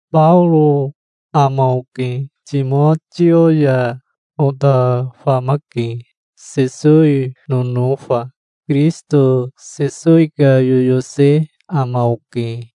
Baoro ama oke. Timotio ya ota famake, Sesowi nonofa. Kirisito Sesowi ka yoyose ama oke,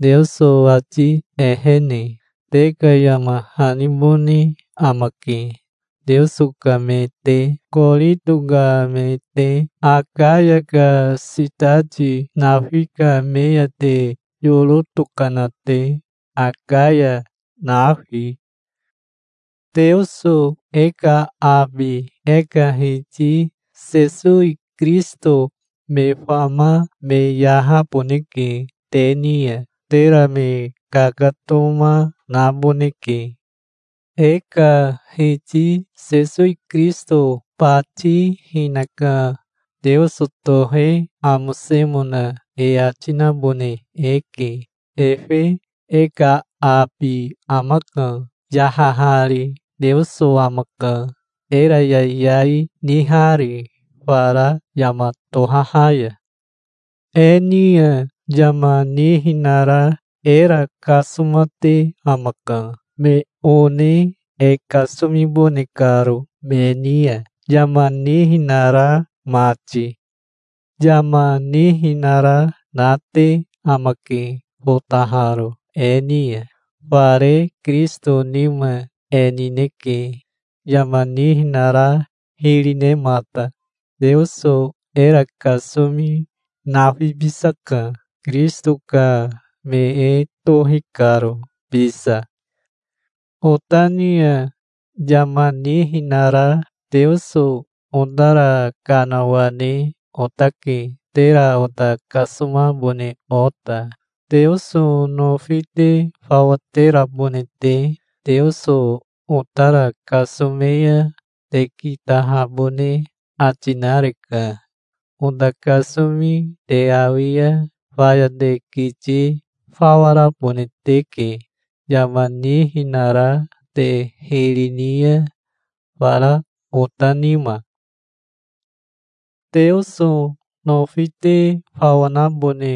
Teoso ati ehene. Te ka yama hanibone amake, Teoso ka me te, Korito ka me te, Akaya ka sitati nafi ka me ya te yoro tokana te, Akaya nafi. Teoso e ka abi e ka Hiti Sesowi Kirisito me fama me yahaboneke te ni ya. Tera me kakatoma naboneke. E ka Hiti Sesowi Kirisito bati hinaka Teoso tohe amosemona e ati nabone eke. Efe e ka abi amaka, yahahari. Teoso amaka, era yayai nihari fara yama tohaha ya. E ni ya yama nihinara era kasomate amaka, me one e kasomibone karo, me ni ya yama nihinara mati. Yama nihinara nate amake fotaharo e ni ya. Fare Kirisito nima e nineke, yama nihinara hiri nemata. Teoso era kasomi nafibisaka, Kirisito ka me e tohi karo bisa. Ota ni ya yama nihinara Teoso otara kanawane otake, tera ota kasomabone ota, Teoso nofi te fawa terabone te. Teoso otara kasome ya te kitahabone ati nareka, ota kasomi te awi ya. Faya te kiti fawa rabone teke yama nihinara te hiri ni ya, fara ota nima. Teoso nofi te fawa nabone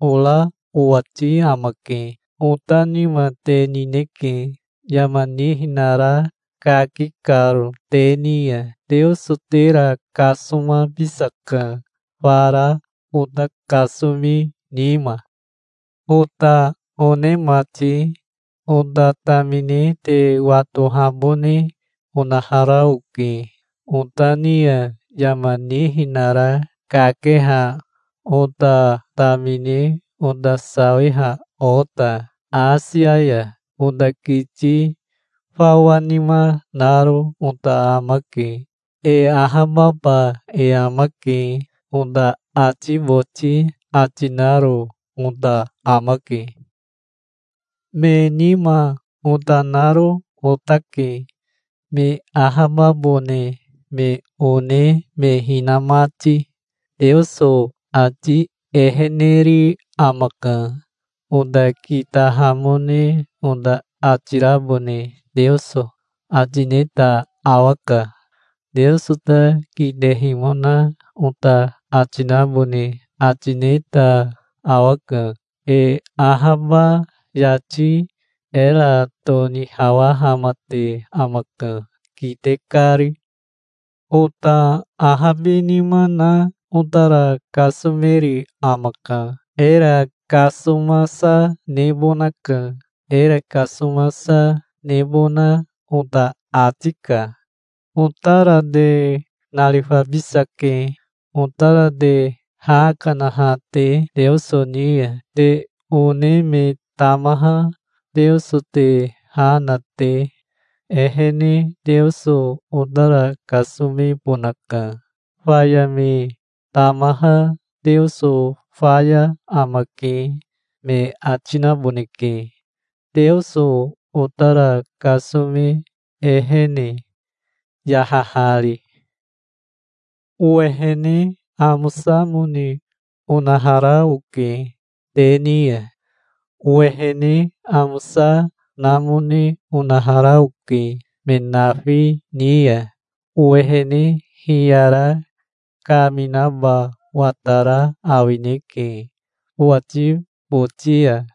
ora owati amake. Ota nima te nineke, yama nihinara kaki karo te ni ya. Teoso tera kasomabisaka, fara ota kasomi nima. Ota one mati, ota tamine te watohabone onahara oke, ota ni ya yama nihinara kakeha ota tamine, ota sawiha ota Asia ya. Ota kiti fawa nima naro ota amake. "E ahababa e amake", ota ati boti ati naro ota amake. Me nima ota naro otake, me ahababone me one me hina mati. Teoso ati eheneri amaka. Ota kitahamone ota ati rabone Teoso ati neta awaka. Teoso ta kitehimona ota ati nabone ati neta awaka. E ahaba yati era tonihawahamate amaka, kite kari. Ota ahabinima na otara kasomeri amaka. Era kasomasa nebonaka. Era kasomasa nebona ota ati ka. Otara te narifabisake, otara te ha kanaha te Teoso ni ya. Te one me tamaha Teoso te ha na te ehene Teoso otara kasomebonaka. Faya me tamaha, "Teoso faya amake", me ati naboneke Teoso otara kasome ehene, yahahari. Owehene amosamone onahara oke te ni ya. Owehene amosa namone onahara oke me nafi ni ya. Owehene hiyara kaminaba watara awineke owati boti ya.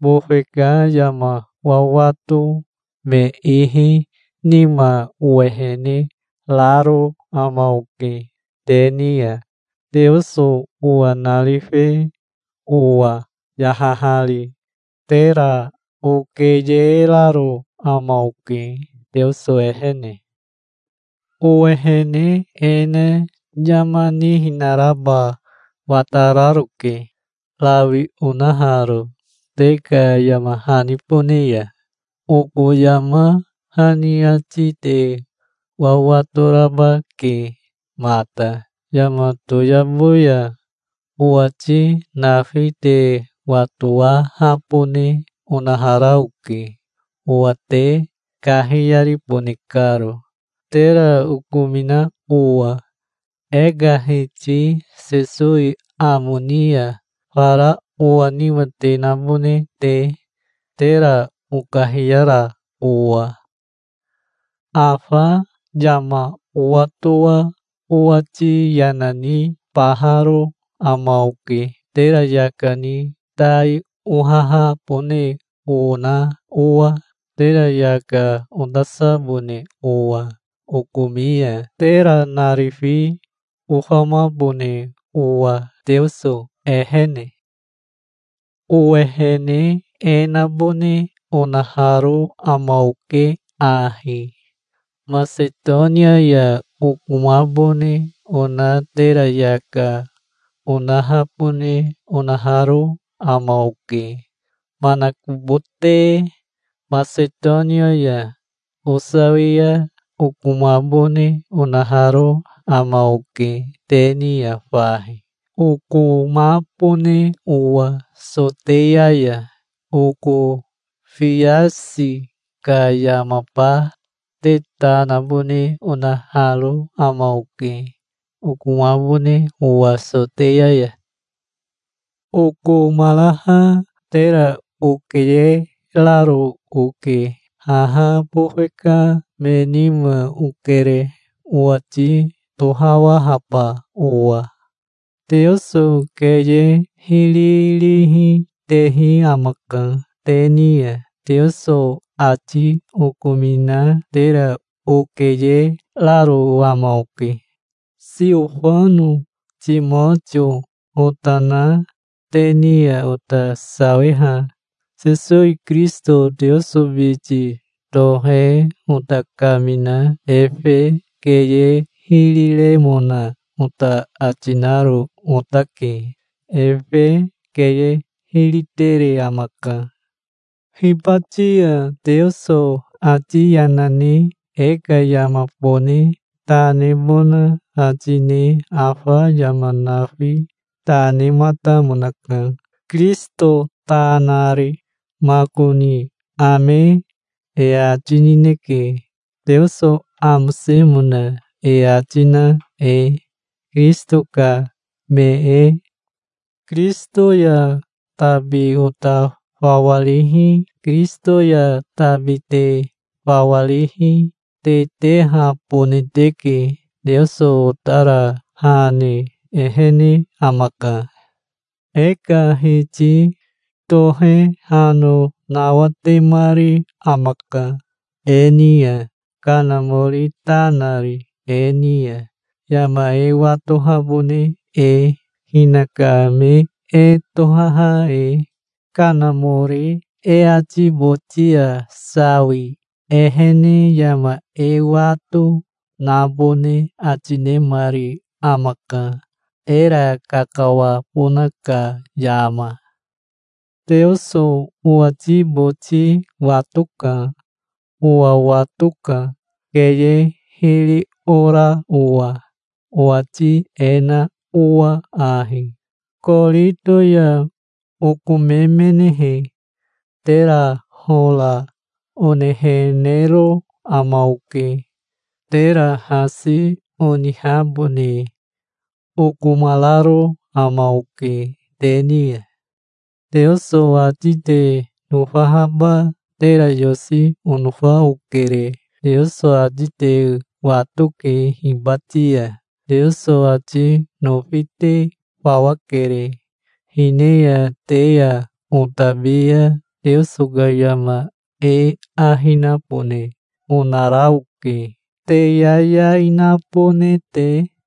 Bofe ka yama wawato me ihi nima owehene raro ama oke te ni ya, Teoso owa narife owa, yahahari. Tera okeyeraro ama oke, Teoso ehene. Owehene e na yama nihinaraba watararoke, rawi onaharo te ka yama hanibone ya. Oko yama hani ati te wawato raba ke mata. Yama toyabo ya owati nafi te watowahabone onahara oke, owa te kahiyaribone karo, tera okomina owa e ka Hiti Sesowi amo ni ya, fara owa nima te nabone te, tera okahiyara owa. Afa yama owatoa owati yana nibaharo ama oke, tera yaka ni tai ohahabone ona owa, tera yaka otasabone owa okomi ya, tera narifi ofamabone owa Teoso ehene. Owehene e nabone onaharo ama oke ahi: Masetonia ya okomabone ona tera yaka onahabone onaharo ama oke. Manakobote Masetonia ya osawia okomabone onaharo ama oke te ni ya fahi, okomabone owa Soteya ya. Oko fiasi ka yamaba te ta nabone onaharo ama oke, okomabone owa Soteya ya. Okomaraha tera okeyeraro oke. Haha bofe ka me nima okere, owati tohawahaba owa. Teoso keye hiri rihi tehi amaka. Te ni ya Teoso ati okomina tera okeyeraro ama oke. Siofano Timotio ota na te ni ya ota sawiha Sesowi Kirisito Teoso biti tohe ota kamina efe keye hiri remona ota ati naro otake. Efe keye hiri tere amaka. Hibati ya Teoso ati yana ne e ka yamabone ta nebona ati ne afa yama nafi ta nematamonaka Kirisito ta nari. Makoni "Ame", e ati nineke, Teoso amosemona e ati na e, Kirisito ka me e. Kirisito ya tabi ota fawa rihi, Kirisito ya tabi te fawa rihi, te tehabone teke. Teoso otara ha ne ehene amaka. E ka Hiti tohe hano nawatemari amaka e ni ya, Kanamori ta nari e ni ya, yama e watohabone e, hinaka me e tohaha e. Kanamori e ati boti ya sawi ehene yama e wato, nabone ati nemari amaka, era kakawabona ka yama. Teoso owati boti watoka. Owa watoka, keye hiri ora owa, owati e na owa ahi: Korito ya okomemenehe, tera hora onehenero ama oke. Tera hasi onihabone okomararo ama oke te ni ya. Teoso ati te nofahaba tera yosi onofa okere. Teoso ati te watoke hibati ya. Teoso ati nofi te fawa kere. Hine ya te ya otabi ya Teoso ka yama e ahi nabone onara oke, te yayai nabone te.